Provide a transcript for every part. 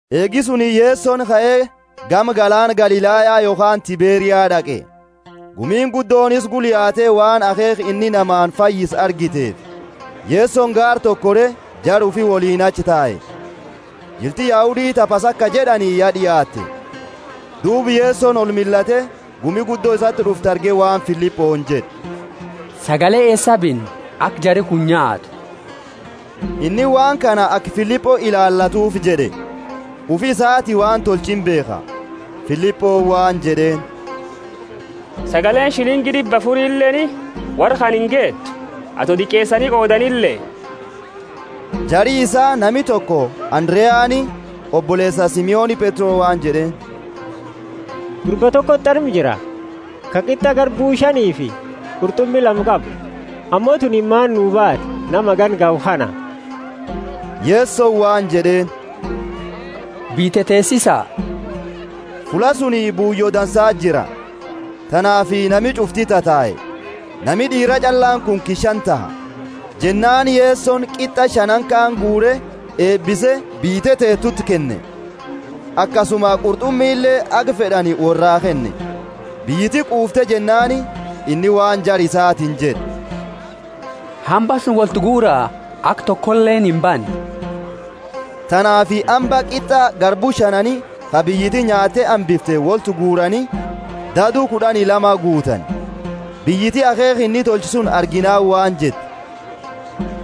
Eegi suni Yesoni kae gama galaana Galilaya (yokhaani Tiberia) d'aqe. Gumiini guddooni isa gula yaate, waan akheekha inni namaani fayyise argiteefi. Yesoni gaara toko kore, jara ufi woliini achi tae. Jilti Yahudi ta Pasaka jed'ani ya d'iaatte. Duuba Yesoni olmillate, gumi guddo isati d'uftu arge waan Filiponi jed'e, Sagale eesaa binna, aka jari kuni nyaatu? Inni waan kana aka Filipo ilaalatuufi jed'e; ufi isaati waan tolchu imbeekha. Filiponi waan jed'eeni, Sagaleeni shilingi d'ibba afurileeni worra kana ingeetu, ato diqeesani qoodanile. Jari isaa nami toko Andareani, oboleesa Simoni Petro waan jed'eeni, Gurba tokoti arma jira, ka qit'a garbu shanifi qurt'umi lama qabu. Ammo tunini maani baati nama hagana gahu kana? Yesoni waan jed'eeni, Biyya teteesisa. Fulla suni buuyo dansa jira. Tanaafi nami ch'ufti tatae. Nami d'iira ch'allaani kunki shani taha. Jennaani Yesoni qit'a shanaani kaani guure, eebise, biyya teteetuti kenne, akasuma qurt'umile haga fed'ani worra kenne. Biyyiti quufte jennaani, inni waan jara isaatiini jed'e, hamba suni wolti guura aka tokoleeni imbanne. Tanaafi hamba qit'a garbu shanaani, ka biyyiti nyaatte hambifte, wolti guurani, dadu kud'ani lama guutani. Biyyiti akheekha inni tolche suni arginaani waan jette,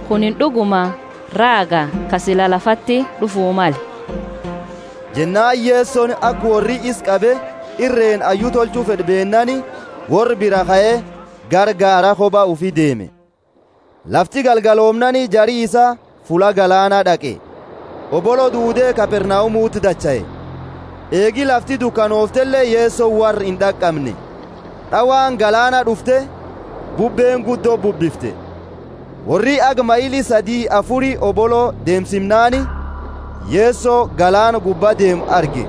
Kunini d'uguma raaga ka sila lafati d'ufu male! Jennaani Yesoni aka worri isa qabe, irreeni hayyu tolchu fed'u beennaani, worra biraa kae gara gaara koba ufi deeme. Lafti galgaloomnaani, jari isaa fulla galaana d'aqe, Hobolo duude Kapernaumuti dachaae. Eegi lafti dukanooftele Yesoni worra ind'aqamne. D'awaani galaana d'ufte, bubbeeni guddo bubbifte. Worri haga maili sadi afuri hobolo deemsimnaani, Yeso galaana gubbaa deemu arge.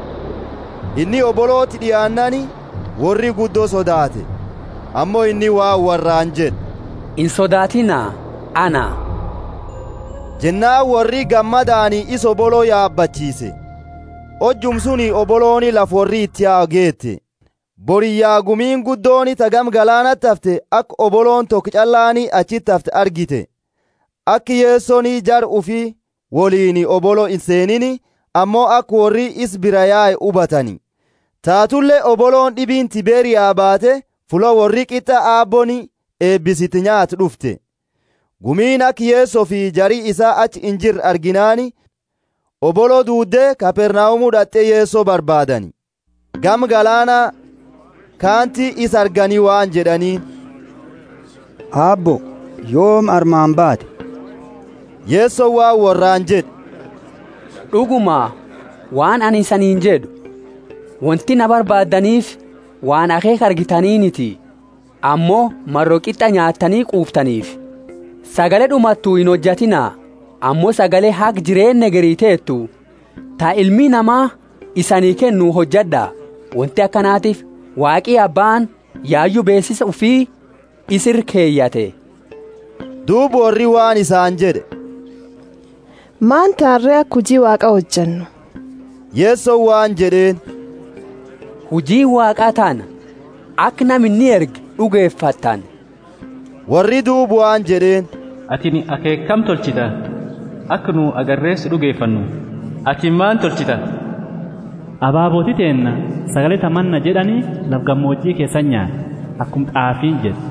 Inni hoboloti d'iaannaani, worri guddo sodaate. Ammo inni waan worraani jed'e, Insodaatiina, Ana! Jennaani worri gammadaani isa hobolo yabachiise; hojuma suni hobolooni lafa worri iti yau geete. Boriyya, gumiini guddooni ta gama galaanati hafte, aka hobolooni toko ch'allaani achiti hafte argite. Aka Yesoni jara ufi woliini hobolo inseeniini, ammo aka worri isa biraa yae hubatani. Taatule hobolooni d'ibiini Tiberia baate, fulla worri qit'a Aabbooni eebise iti nyaate d'ufte. Gumiini aka Yesofi jari isaa achi injirre arginaani, hobolo duude Kapernaumu d'at'e Yeso barbaadani. Gama galaana kaanti isa argani waan jed'aniini, Aabbo, yoomi armaani baate? Yesoni waan worraani jed'e, D'uguma, waan anini isaniini jed'u, wonti na barbaaddaniifi waan akheekha argitaniniti, ammo maro qit'a nyaattani quuftaniifi. Sagale d'umattu inhojatiina, ammo sagale haga jireenna hegeri teetu ta Ilmi Nama isanii kennu hojad'a, wonti akanatiifi Waaqi Abbaani yayu beesisa ufi isa ira keyate. Duuba worri waan isaani jed'e, Maani taana re, aka huji Waaqa hojannu? Yesoni waan jed'eeni, Hujiini Waaqa tana, aka nama inni erge d'ugefattani. Worri duuba waan jed'eeni, Atini akheekha kami tolchita, aka nu agarre si d'ugefannu? Atini maani tolchita? Ababooti teenna sagale ta Manna jed'ani lafa gamooji keesati nyaatte, akuma t'aafiini jettu,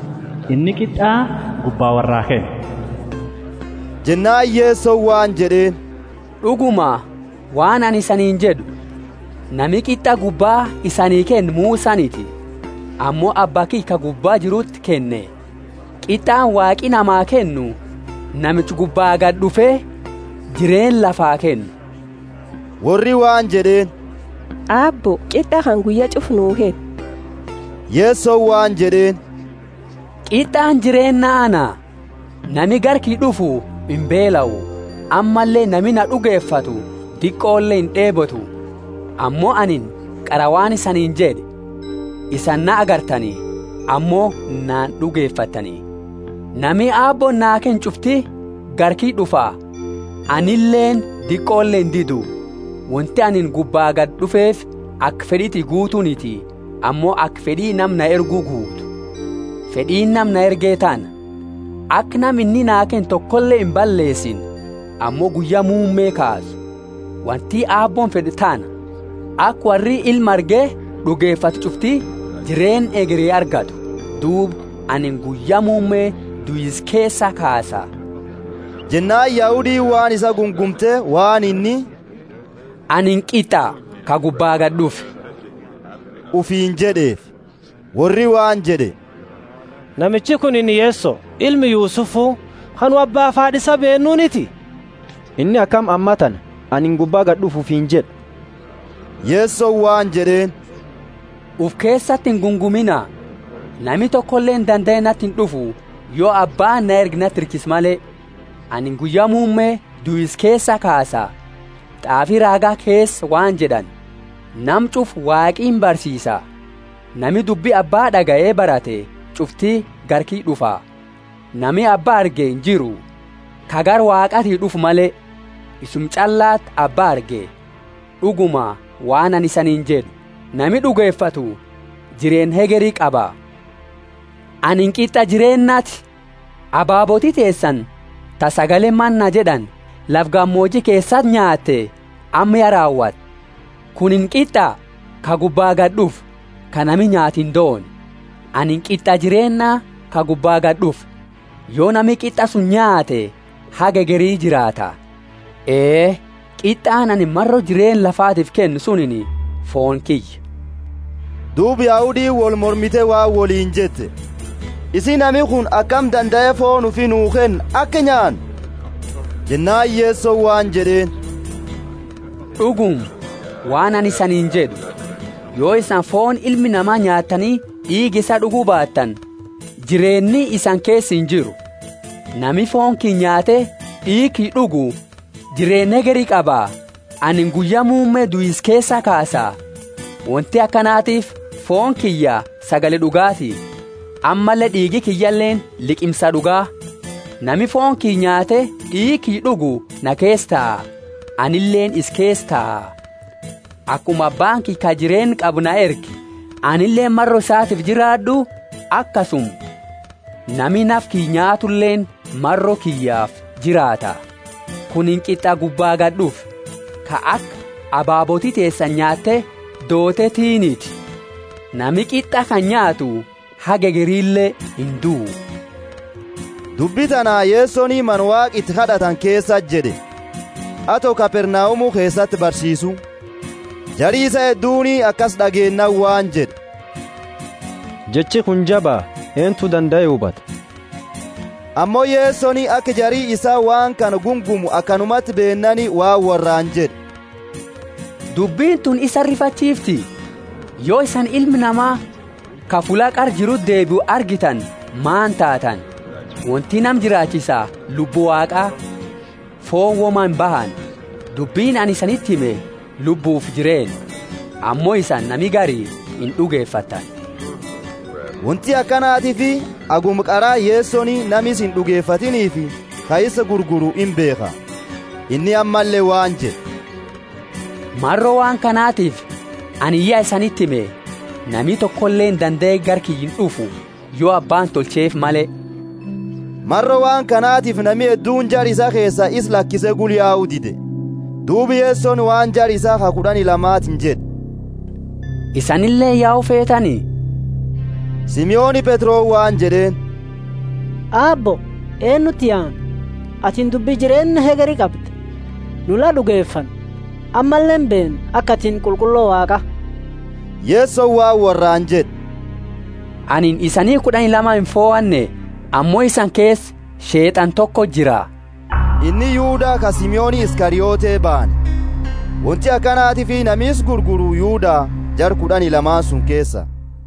Inni qit'a gubbaa worraa kenne. Jennaani Yesoni waan jed'eeni, D'uguma, waan anini isaniini jed'u, Nami qit'a gubbaa isani kenne Musaniti, ammo Abba kiyya ka gubba jiruti kenne. Qit'aani Waaqi namaa kennu namicha gubbaa gadi d'ufe jireenna lafaa kennu. Worri waan jed'eeni, Aabbo, qit'a kana guyya ch'ufa nuu kenni. Yesoni waan jed'eeni, Qit'aani jireenna ana. Nami gara kiyya d'ufu imbeelau, ammalle nami naa d'ugefatu diqole ind'eebotu. Ammo anini qara waan isaniini jed'e, Isani na agartani, ammo na ind'ugefattani. Nami Aabbooni naa kenne ch'ufti gara kiyya d'ufa, anileeni diqole indidu. Wonti anini gubbaa gadi d'ufeefi aka fed'i tiyya guutuuniti, ammo aka fed'i nama na erge guutu. Fed'iini nama na erge tana, aka nama inni naa kenne tokole imballeesine, ammo guyya muumme kaasu. Wonti Aabbooni fed'u tana: aka worri Ilma arge d'ugefatu ch'ufti jireenna hegeri argatu; duuba anini guyya muumme duisa keesaa kaasa. Jennaani Yahudiini waan isaa gungumte, waan inni, Anini qit'a ka gubbaa gadi d'ufe ufiini jed'eefi. Worri waan jed'e, Namichi kunini Yeso, ilma Yusufu, ka nu abbaafi haad'a isaa beennuuniti? Inni akami ammatana, Anini gubbaa gadi d'ufe ufiini jed'a? Yesoni waan jed'eeni, Ufi keesati ingungumiina. Nami tokoleeni dandae nati ind'ufu, yo Abbaani na erge nati hirkise male; anini guyya muumme duisa keesaa kaasa. T'aafi raaga keesa waan jed'ani, Nama ch'ufa Waaqi imbarsiisa. Nami dubbi Abba d'agaye barate ch'ufti gara kiyya d'ufa. Nami Abba arge injiru, ka gara Waaqaati d'ufe male, isuma ch'allati Abba arge. D'uguma, waan anini isaniini jed'u, Nami d'ugefatu jireenna hegeri qaba. Anini qit'a jireennaati. Ababooti teesani ta sagale manna jed'ani lafa gamooji keesati nyaate, amma ya raawatte. Kunini qit'a ka gubbaa gadi d'ufe, ka nami nyaate indoone. Anini qit'a jireenna ka gubbaa gadi d'ufe. Yo nami qit'a suni nyaate haga hegeri jiraata. Ee, qit'aani anini maro jireenna lafatiifi kennu sunini fooni kiyya. Duuba Yahudiini wolmormite waan woliini jette, Isii, nami kuni akami dandae fooni ufi nuu kenna aka nyaannu? Jennaani Yesoni waan jed'eeni, D'uguma, waan anini isaniini jed'u, Yo isani fooni Ilma Nama nyaattani d'iiga isaa d'ugu baattani, jireenni isani keesa injiru. Nami fooni kiyya nyaate d'iiga kiyya d'ugu jireenna hegeri qaba, anini guyya muumme duisa keesaa kaasa. Wonti akanatiifi fooni kiyya sagale d'ugaati, ammalle d'iigi kiyyaleeni liqimsaa d'uga. Nami fooni kiyya nyaate d'iiga kiyya d'ugu na keesa taa, anileeni isa keesa taa. Akuma Abbaani kiyya ka jireenna qabu na erge, anileeni maro isatiifi jiraad'u, akasuma nami nafa kiyya nyaatuleeni maro kiyyafi jiraata. Kunini qit'a gubbaa gadi d'ufe, ka aka ababooti teesani nyaatte dooteetiiniti. Nami qit'a kana nyaatu haga hegerile induu. Dubbi tana Yesoni mana Waaqa iti kad'atani keesati jed'e, ato Kapernaumu keesati barsiisu. Jari isaa hedduuni akasi d'ageennaani waan jed'e, Jechi kuni jaba, eentu dandae hubata? Ammo Yesoni aka jari isaa waan kana gungumu akanumati beennaani waan worraani jed'e, Dubbini tuni isani rifachiifti? Yo isani Ilma Nama ka fulla qara jiruti deebiu argitani maani taatani? Wonti nama jiraachisa Lubbu Waaqaa; fooni woma imbahani. Dubbini anini isaniti hime Lubbufi jireenna. Ammo isani nami gari ind'ugefattani. Wonti akanatiifi haguma qara Yesoni nama isa ind'ugefanneefi ka isa gurguru imbeekha. Inni ammalle waan jed'e, Maro waan kanatifi anini ya isaniti hime, nami tokoleeni dandae gara kiyya ind'ufu, yo Abbaani tolcheefi male. Maro waan kanatifi nami hedduuni jara isaa keesa isa lakise gula yau dide. Duuba Yesoni waan jara isaa ka kud'ani lamatiini jed'e, Isanileeni yau feetani? Simoni Petroni waan jed'eeni, Aabbo, eennuti yaana? Atini dubbi jireenna hegeri qabda. Nu la d'ugefanne, ammalle imbeenna aka atini Qulqullo Waaqa. Yesoni waan worraani jed'e, Anini isani kud'ani lama imfohanne? Ammo isani keesa Sheet'ana tokoti jira. Inni Yuda ka Simoni Iskariote baane. Wonti akanatiifi nami isa gurguru Yuda, jara kud'ani lamaani suni keesa.